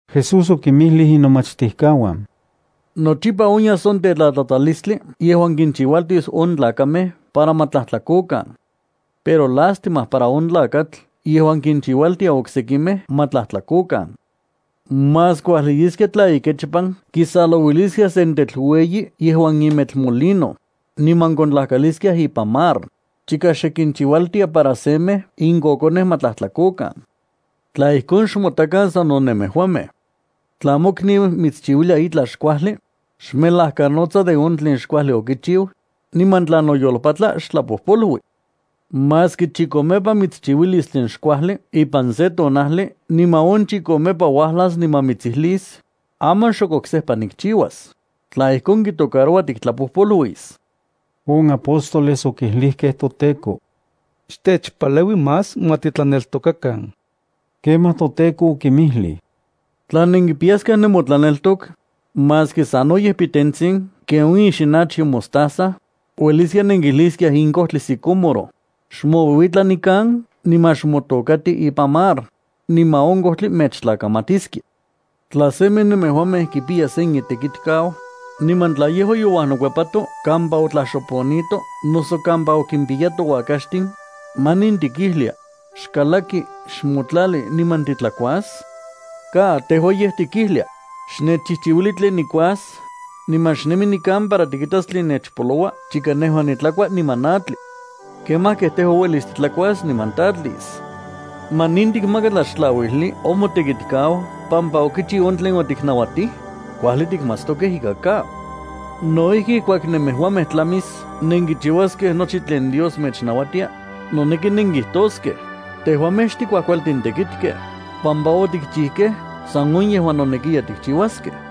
Jesús okinmijlij inomachtijkauan: —Nochipa onyas on tetlatlatalistli yejuan kinchiualtis on tlakamej para ma tlajtlakokan. Pero ¡lástima para on tlakatl yejuan kinchiualtia oksekimej ma tlajtlakokan! Más kuajli yeskia tla ikechpan kisalouiliskiaj sen tetl ueyi yejuan imetl molino, niman kontlajkaliskiaj ipan mar, chika xe kinchiualtia para semej in kokonej ma tlajtlakokan. Tla ijkon, xmotakan sano nemejuamej. ’Tla mokniu mitschiuilia itlaj xkuajli, xmelajkanotsa de on tlen xkuajli okichiu, niman tla noyolpatla, xtlapojpolui. Maski chikomepa mitschiuilis tlen xkuajli ipan se tonajli niman on chikomepa uajlas niman mitsijlis: “Aman xok oksejpa nikchiuas”, tla ijkon kitocaroua tiktlapojpoluis. On apóstoles okijlijkej toTEKO: —Xtechpaleui más ma titlaneltokakan. Kemaj toTEKO okinmijlij: —Tla nenkipiyaskiaj nemotlaneltok, maski sanoyej pitentsin ken on ixinachyo mostaza, ueliskia nenkijliskiaj in kojtli sicómoro: “Xmouiuitla nikan niman xmotokati ipan mar”, niman on kojtli mechtlakamatiskia. ’Tla semej nemejuamej kipiya sen itekitkau, niman tla yejua youajnokuepato kampa otlaxoponito noso kampa okinpiyato uakaxtin, ¿manin tikijlia: “Xkalaki; xmotlali niman titlakuas”? Ka, tejua yej tikijlia: “Xnechchijchiuili tlen nikuas, niman xnemi nikan para tikitas tlen nechpoloua chika nejua nitlakua niman natli. Kemaj kej tejua uelis titlakuas niman tatlis.” ¿Manin tikmaka tlaxtlauijli on motekitkau pampa okichiu on tlen otiknauatij? Kuajli tikmatstokej ika ka. No ijki ijkuak nemejuamej tlamis nenkichiuaskej nochi tlen Dios mechnauatia, noneki nenkijtoskej: “Tejuamej xtikuajkualtin titekitkej, pampa otikchijkej san on yejuan nonekiya tikchiuaskej.”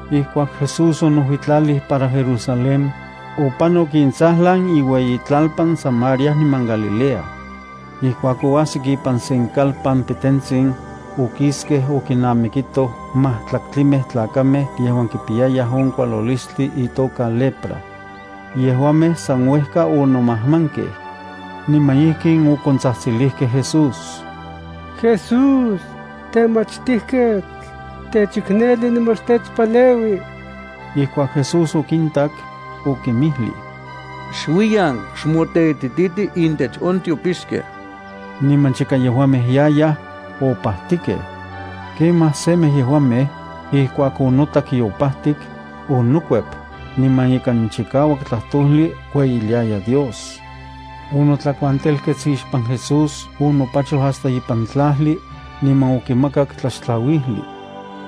Ijkuak Jesús onojuitlalij para Jerusalén, opanok intsajlan iueyitlalpan Samaria niman Galilea. Ijkuak oajsik ipan sen kalpan pitentsin, okiskej okinamikitoj majtlaktlimej tlakamej yejuan kipiyayaj on kualolistli itoka lepra. Yejuamej san uejka onomajmankej, niman ijkin okontsajtsilijkej Jesús: —¡Jesús, Temachtijketl, xtechikneli niman xtechpaleui! Ijkuak Jesús okintak, okinmijlij: —Xuiyan; xmoteitititij intech on tiopixkej. Niman chika yejuamej yayaj, opajtikej. Kemaj semej yejuamej, ijkuak onotak yopajtik, onokuep, niman ikan chikauak tlajtojli kueyiliaya Dios. Onotlakuantelkets ixpan Jesús onopachoj hasta ipan tlajli, niman okimakak tlaxtlauijli.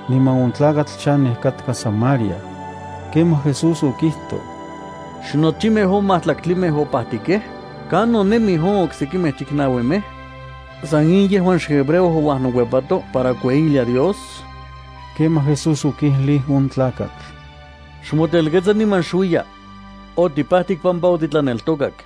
Niman on tlakatl chanej katka Samaria. Kemaj Jesús okijtoj: —¿Xnochimej on majtlaktlimej opajtikej? ¿Kanon nemij on okse chiknauimej? ¿San in yejuan xhebreo ouajnokuepato para kueyilia Dios? Kemaj Jesús okijlij on tlakatl: —Xmotelketsa niman xuiya. Otipajtik pampa otitlaneltokak.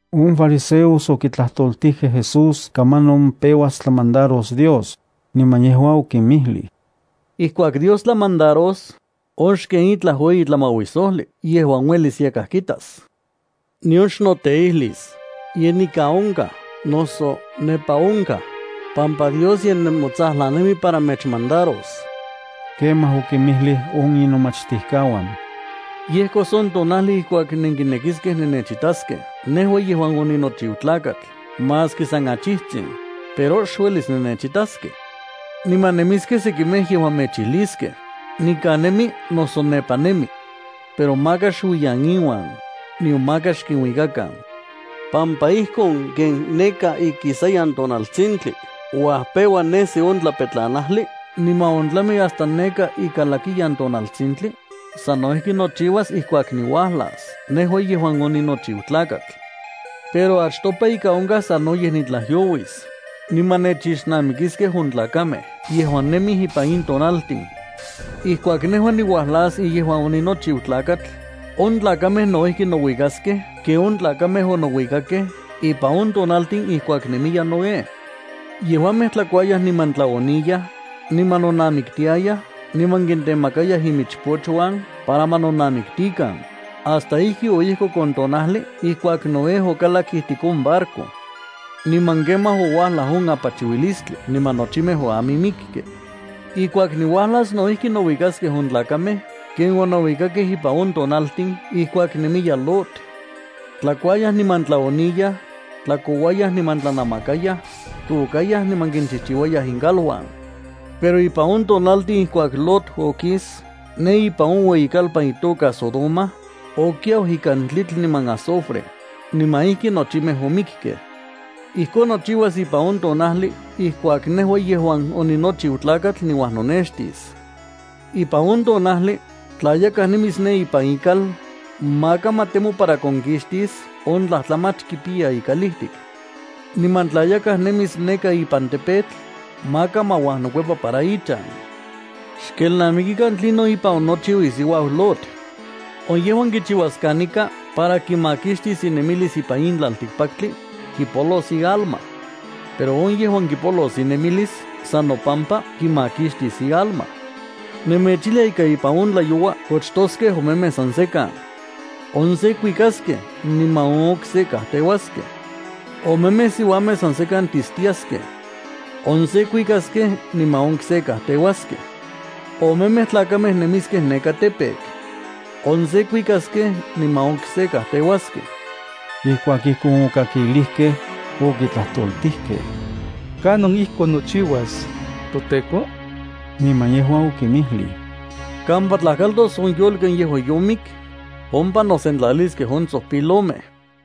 On fariseos okitlajtoltijkej Jesús kamanon peuas tlamandaros Dios, niman yejua okinmijlij: —Ijkuak Dios tlamandaros, on xken itlaj ueyi tlamauisojli yejuan uelis yakaj kitas. Nion xnoteijlis: “Ye nikan onkaj”, noso “Nepa onkaj”, pampa Dios ye nemotsajlan nemi para mechmandaros. Kemaj okinmijlij on inomachtijkauan: —Yejkos on tonajli ijkuak nenkinekiskej nennechitaskej nejua yejuan oninochiu Tlakatl maski san achijtsin, pero xuelis nennechitaskej. Niman nemiskej sekimej yejuan mechijliskej: “Nikan nemi”, noso “Nepa nemi.” Pero maka xuiyan inuan, nion maka xkinuikakan, pampa ijkon ken neka ikisayan tonaltsintli uajpeua nesi on tlapetlanajli niman ontlami hasta neka ikalakiyan tonaltsintli, sano ijki nochiuas ijkuak niuajlas nejua yejuan oninochiu Tlakatl. Pero achtopa ika onkaj sanoyej nitlajyouis, niman nechixnamikiskej on tlakamej yejuan nemij ipan in tonaltin. Ijkuak nejua niuajlas yejuan oninochiu Tlakatl, on tlakamej no ijki nouikaskej ken on tlakamej onouikakej ipan on tonaltin ijkuak nemiya Noé. Yejuamej tlakuayaj niman tlaoniyaj, niman nonamiktiayaj niman kintemakayaj imichpochuan para ma nonamiktikan, hasta ijki oyejkok on tonajli ijkuak Noé okalak ijtik on barco. Niman kemaj, ouajlaj on apachiuilistli niman nochimej oamimikkej. Ijkuak niuajlas no ijki nouikaskej on tlakamej ken onouikakej ipan on tonaltin ijkuak nemiya Lot. Tlakuayaj niman tlaoniyaj, tlakouayaj niman tlanamakayaj, tôkayaj niman kinchijchiuayaj inkaluan. Pero ipan on tonajli ijkuak Lot okis ne ipan on ueyikalpan itoka Sodoma, okiau ikan tlitl niman azufre, niman ijki nochimej omikkej. Ijkon nochiuas ipan on tonajli ijkuak nejua yejuan oninochiu Tlakatl niuajnonextis. ’Ipan on tonajli, tla yakaj nemis ne ipan ikal, maka ma temo para konkixtis on tlajtlamach kipiya ikalijtik. Niman tla yakaj nemis neka ipan campo, maka ma uajnokuepa para ichan. Xkelnamikikan tlinon ipan onochiu isiuau Lot. On yejuan kichiuas kanika para kimakixtis inemilis ipan in tlaltikpaktli, kipolos ialma. Pero on yejuan kipolos inemilis san nopampa kimakixtis ialma. ’Nemechijlia ika ipan on tlayoua kochtoskej omemej san sekan. On se kuikaskej niman on okse kajteuaskej. Omemej siuamej san sekan tistiaskej. On se kuikaskej niman on okse kajteuaskej. Omemej tlakamej nemiskej ipan campo. On se kuikaskej niman on okse kajteuaskej. Ijkuak ijkon okikakilijkej, okitlajtoltijkej: —¿Kanon ijkon nochiuas, toTEKO? Niman yejua okinmijlij: —Kampa tlajkaltos on yolki yejuan yomik, ompa nosentlaliskej on tsojpilomej.